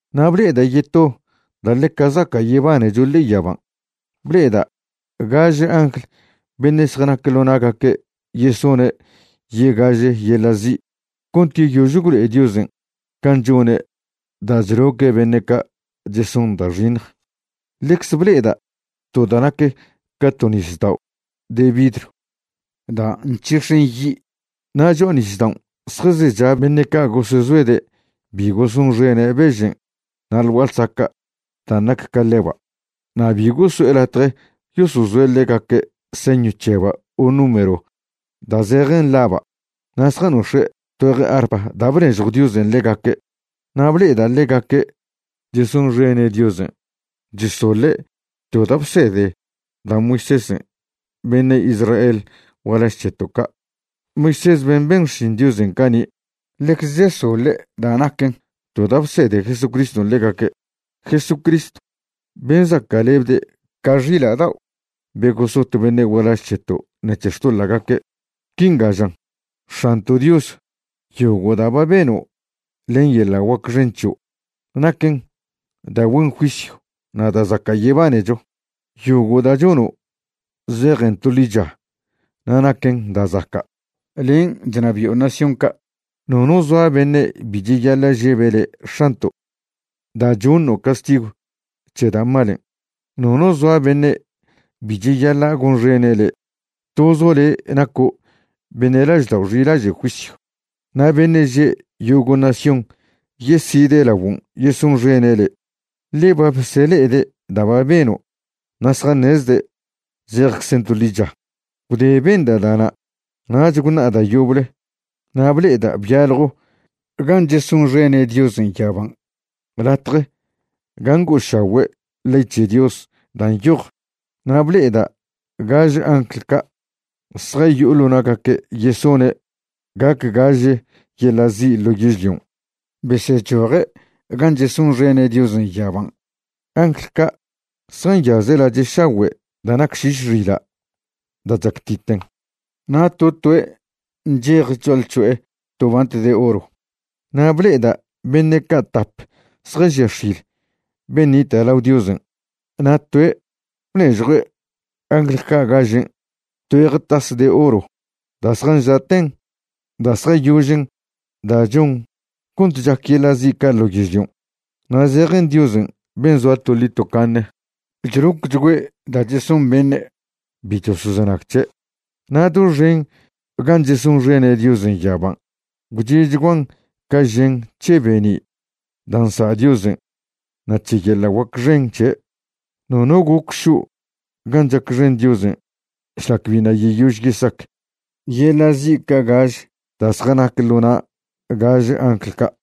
Na' ble'eda' yeto da' ḻeca zaca' yebanecho ḻe'e yaban'. Ble'eda' gaže angl beṉe' zjanac ḻo na'gaque' yesone' yegaže yeḻa' zi' cont yeyož gwlo'e Diosen' can' chone' da' chloque' beṉe' ca' cheson da' xiṉj. Ḻecze ble'eda' to da' nac ca to nisdao' de vidrw da' nc̱hix̱en yi'. Na' cho'a nisdaon' zjazecha beṉe' ca' gosezoede' bi gosonxene' bežen' na' ḻ gua'a ḻsaca' dan' nac ca ḻeba', na' bi goso'e latje yosozoe' ḻegaque' señw c̱heba' o número da' zejen laba'. Na' zjanox̱e' tgüeje arpa da' bnežjw Diosen' ḻegaque'. Na' ble'eda' ḻegaque' chesonxene' Diosen' chesoḻe' to da' bsede da' Moisésen' beṉe' Israel gualaž c̱heto' ca', Moisés ben' ben xšin Diosen' cani'. Ḻecze chesoḻe' da' naquen to da' bsede Jesucriston' ḻegaque', Jesucristw ben' zaca'lebde' ca xila' dao' be gosot beṉe' gualaž c̱heto' ṉec̱he xtoḻa'gaque'. Quinga žan: X̱anto' Dios, yogo' da' ba beno' len yeḻa' guac xen c̱hio' naquen da' güen juisyw na' da' zaca' yebanecho. Yogo' da' chono' zejen to ḻicha na' naquen da' zaca'. Len' chnabi'o nación ca'. Nono zoa beṉe' bi cheyaḻa' žebe' le' X̱anto', da' choṉo' castigw c̱he da' malen'. Nono zoa beṉe' bi cheyaḻa' gonxene' le'. Tozo' le' naco' beṉe' laždao' xilaže' juisyw. Na' beṉe' že' yogo' nación yeside' laguon' yesonxene' le', ḻe ba besele'ede' da' ba beno' na' zjaṉezde' zejczen to ḻicha. Gwde benda' da'na' nach gwṉa'a da' yoble na' ble'eda' byaljo gan' chesonxene' Diosen' yaban', latje gan' ngo'ošagüe' ley c̱he Dios da' nyoj. Na' ble'eda' gaž angl ca' zjayo'o ḻo na'gaque' yesone' gac gaž yeḻa' zi' ḻo yežlion', besechoje' gan' chesonxene' Diosen' yaban'. Angl ca' zjanyaze' lache' šagüe' da' nac šiš xila' da' chactiten, na' to toe' nchej cho'alc̱ho'e to bant de oro. Na' ble'eda' beṉe' ca' tap zjažia x̱il ben' nita' lao Diosen', na' toe' bnežjue' angl ca' gažen' tgüeje tas de oro da' zjanža'ten da' zjayožen da' chon cont chac yeḻa' zi' ca' ḻo yežlion', na' zejen Diosen' ben' zoa toḻi tocaṉe chlocchgüe' da' cheson beṉe' bi chosozenag c̱he'. Na' doxen gan' chesonxene' Diosen' yaban' gwche'chguan ca žen c̱he be'ni' da' nsa' Diosen' na' c̱he yeḻa' guac xen c̱he'. Nono goc šo' gan' chacxen Diosen' šlac biṉa' yeyož yesac yeḻa' zi' ca' gaž da' zjanac ḻo na' gaž angl ca'.